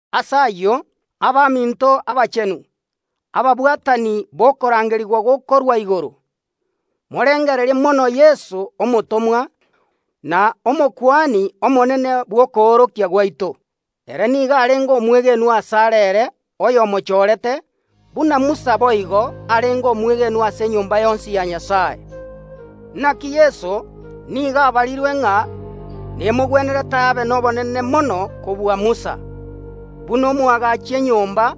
Ase ayio, abaminto abachenu, ababwatani b’okorangerigwa gokorwa igoro, morengererie mono Yeso omotomwa na Omokuani Omonene bw’okoorokia gwaito. Ere nigo arenge omwegenwa asare ere oyomochorete, buna Musa boigo arenge omwegenwa ase enyomba yonsi ya Nyasae. Naki Yeso nigo abarirwe ng’a nemogwenerete abe nobonene mono kobua Musa, buna omoagachi enyomba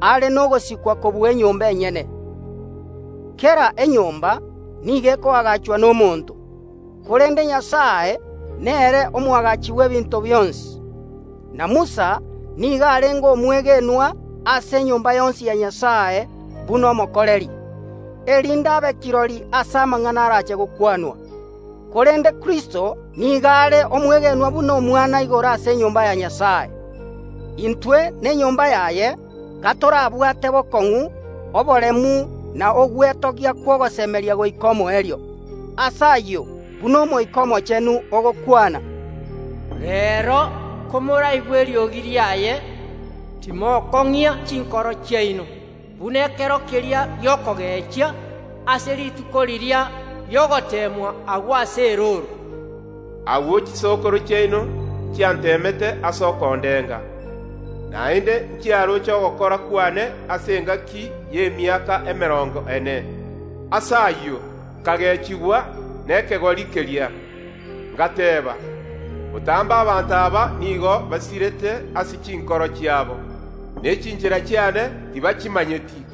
are nogosikwa kobua enyomba enyene. (Kera enyomba nigo ekoagachwa nomonto, korende Nyasae nere omoagachi bw’ebinto bionsi.) Na Musa nigo arenge omwegenwa ase enyomba yonsi ya Nyasae buna omokoreri, erinde abe kirori ase amang’ana arache gokwanwa, korende Kristo nigo are omwegenwa buna Omwana igoro ase enyomba ya Nyasae. Intwe nenyomba yaye gatorabwate bokong’u oboremu na ogwetogia kw’ogosemeria goika omoerio. Ase ayio, buna Omoika Omochenu ogokwana, “Reero, komoraigwe eriogi riaye, timokong’ia chinkoro chiaino, buna ekero keria gi’okogechia, ase rituko riria ri’ogoteemwa agwo ase erooro. Agwo chisokoro chiaino nchianteemete ase okondenga, naende nchiaroche ogokora kwane ase engaki y’emiaka emerongo ene. Ase ayio, nkagechigwa nekegori keria, ngateba: Botambe abanto aba nigo basirete ase chinkoro chiabo, ne chinchera chiane tibachimanyeti,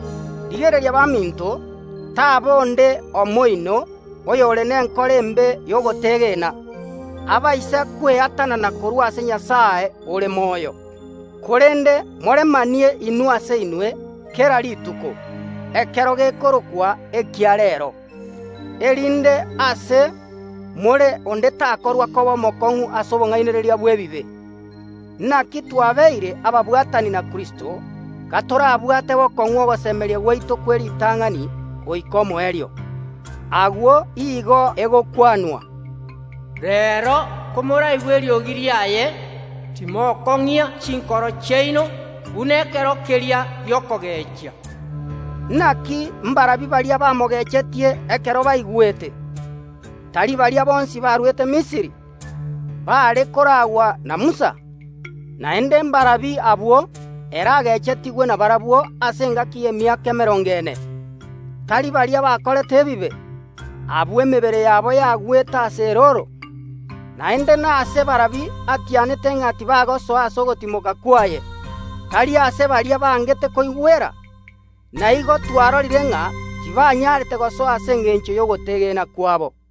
Rigereria baminto, taba onde omo oino oyore nenkoro embe y’ogotegena, abaise kweatanana korwa ase Nyasae ore moyo. Korende moremanie inwe ase inwe kera rituko, ekero gekorokwa ekia Reero, erinde ase, more onde takorwa koba omokong’u ase obong’ainereria bw’ebibe. Naki twabeire ababwatani na Kristo, gatorabwate bokong’u ogosemeria gwaito kw’eritang’ani goika omoerio. Agwo igo egokwanwa, “Reero, komoraigwe eriogi ria Nyasae, timokong’ia chinkoro chiaino’ buna ekero keria gi’okogechia.” Naki mbarabi baria bamogechetie ekero baigwete? Tari baria bonsi barwete Misiri, baare koraagwa na Musa? Naende mbarabi abwo ere agechetigwe nabarabwo ase engaki y’emiaka emerongo ene? Tari baria bakorete ebibe, abwo emebere yabo yagwete ase erooro? Naende nase barabi atianete ng’a tibagosoa ase ogotimoka kwaye? Tari ase baria bangete koigwera? Na igo twarorire ng’a tibanyarete gosoa ase ense eria ase engencho y’ogotegena kwabo.